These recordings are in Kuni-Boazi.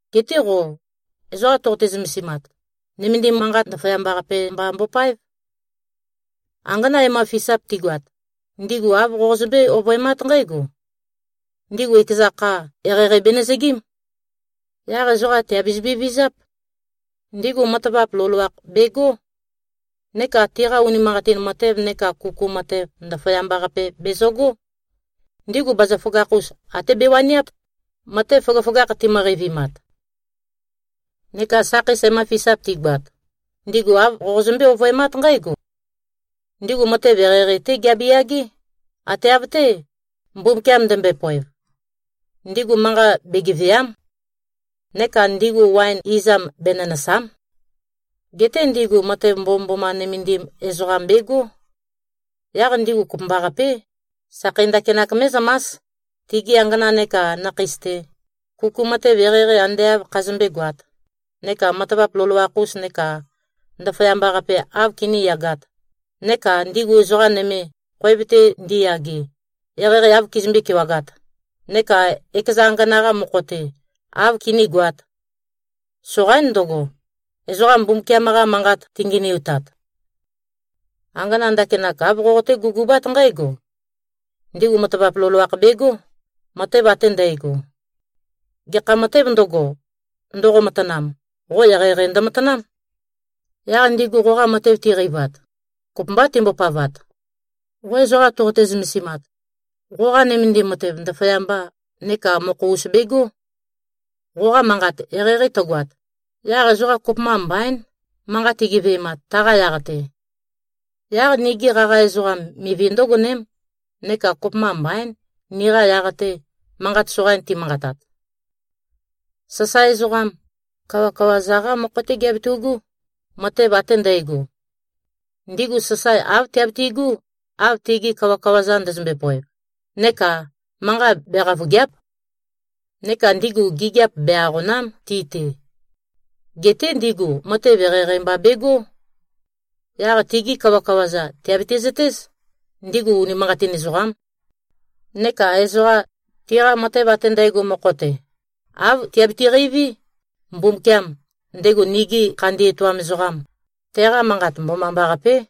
Geté qo ezoqa toqote-zømesimat, nømendim manqat ndaføyamba-qape mba mbopáev. Angana e-ma-fisap tigoat, ndigu āv qozømbé-ovøemát nqǽgo: Ndigu ekeza kha, eqeieqei benøzøgím. Yaq ezoqa, tìabezømbe-vizáp. Ndigu matavap loloakh begó. Neka tiqa unimanqatin matev neka kuku matev, ndaføyamba-qape bezøgó. Ndigu bazaføgakh-us até bewaniáp, matev føgøføgakh timø-qeivimat. Neka sakheis e-ma-fisap tigoat, ndigu āv qozømbé-ovøemát nqǽgo: Ndigu matev eqeieqei-té giabe-yagé, ate av-té, Mbumbukiam ndømbøe-poev. Ndigu manqa begevèa᷄m. Neka ndigu waen izam benønø̀sa᷄m. Geté ndigu matev mbomømboma nømendim ezoqam begó. Yaq ndigu kopømbaqapé, sakhei ndakinak mé꞉zømás, tigi angana neka nakheis-te, kuku matev eqeieqei ande āv khazømbé-goāt, neka matavap loloakh-us neka ndaføyamba-qape āv kiníyagāt, neka ndigu ezoqa nøme, khoev-te ndiyage, eqeieqei āv kizømbé-kewagāt, neka ekeza angana-qa mokho-te āv kinígoāt. Soqaín ndøgo, ezoqa Mbumbukiam-qa Manqat tingenøitat. Angana ndakinak, āv qoqoté-gugubát nqǽgo: Ndigu matavap loloakh begó, matev ate ndægo. Gekha matēv ndøgo, ndoqo-matanam, qo eqeieqei ndømatanám. Yaq ndigu qoqa matev tiqeivat, kopømbá timbopavat. Qo ezoqa toqote-zømesimat, qoqa nømendim matev ndaføyamba neka mokho-us begó. Qoqa manqat eqeieqei tøgoat, yaq ezoqa kopømba mbaín, manqa tigeve꞉mat taqa yaq-te. Yaq nigi qaqa ezoqam mivi ndǿgoném neka kopømba mbaín, niqa yaq-te, manqat soqain timanqatat. Sasae ezoqam, kawakawa-za-qá mokho-té giabetu꞉gú, matev ate ndægo. Ndigu sasae āv tiabitigú, av tigi kawakawa-za ndøzømbe-poev neka manqa beqavøgèa᷄p. Neka ndigu gigiap be-aqòna᷄m, ti-te. Geté ndigu matev eqeieqei mba begó. Yaq tigi kawakawa-za tìabiti-zøtéz, ndigu unimanqatin ezoqám. Neka ezoqa, tiqa matev ate ndægo mokho-te, āv tiabiti-qeiví, Mbumbukiam, ndego nigi khandi etoam ezoqam, teqa manqat mbomambaqapé.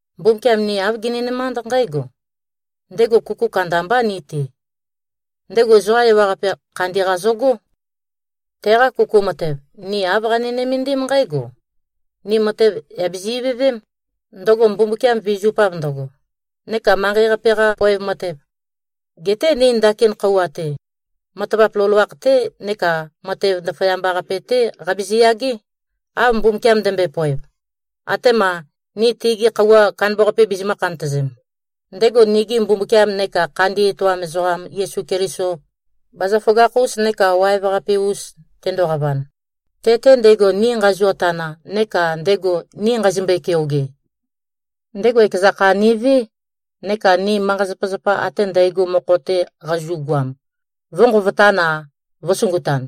Mbumbukiam ni āv gininømánd nqǽgo: Ndego kuku kandambá ni-te. Ndego ezoqa ewaqape khandi-qa zøgó. Teqa kuku matev, ni āv qani-nømendím nqǽgo: Ni matev yà bizi-ivøvém, ndøgo Mbumbukiam vizupav ndøgo, neka manqei-qape-qa poev matev. Geté ni ndakin khøuwa-te, matavap loloakh-té neka matev ndaføyamba-qape-té qabizi-yagé, av Mbumbukiam ndømbøe-poev, atema ni tegi khøuwa kandambaqape bizimø̄-khantøzem, ndego nigi Mbumbukiam neka khandi etoam ezoqam Yesu Keliso, bazaføgakh-us neka waev-qape-us tendoqavan, te-te ndego ni nqazio-tana neka ndego ni nqazimbøe-keoge. Ndego ekeza kha nivé, neka ni manqa-zapazapa ate ndægo mokho-te qazu꞉goam, vø̄nqovotan-a, vø̄sungutan.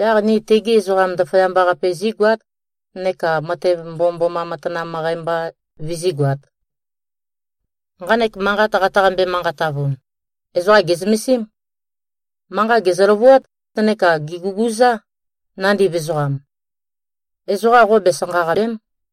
Yaq ni tegi ezoqa ndaføyamba-qape zígoát, neka matev mbomømboma matanam møqæ mba vizígoāt. Nqanek manqat qataqambe-manqatavun, ezoqa gè꞉zømesím. Manqa gèzø-løvuát neka gèguguzá, nandiv ezoqam. Ezoqa qo besanqaqàbe᷄m.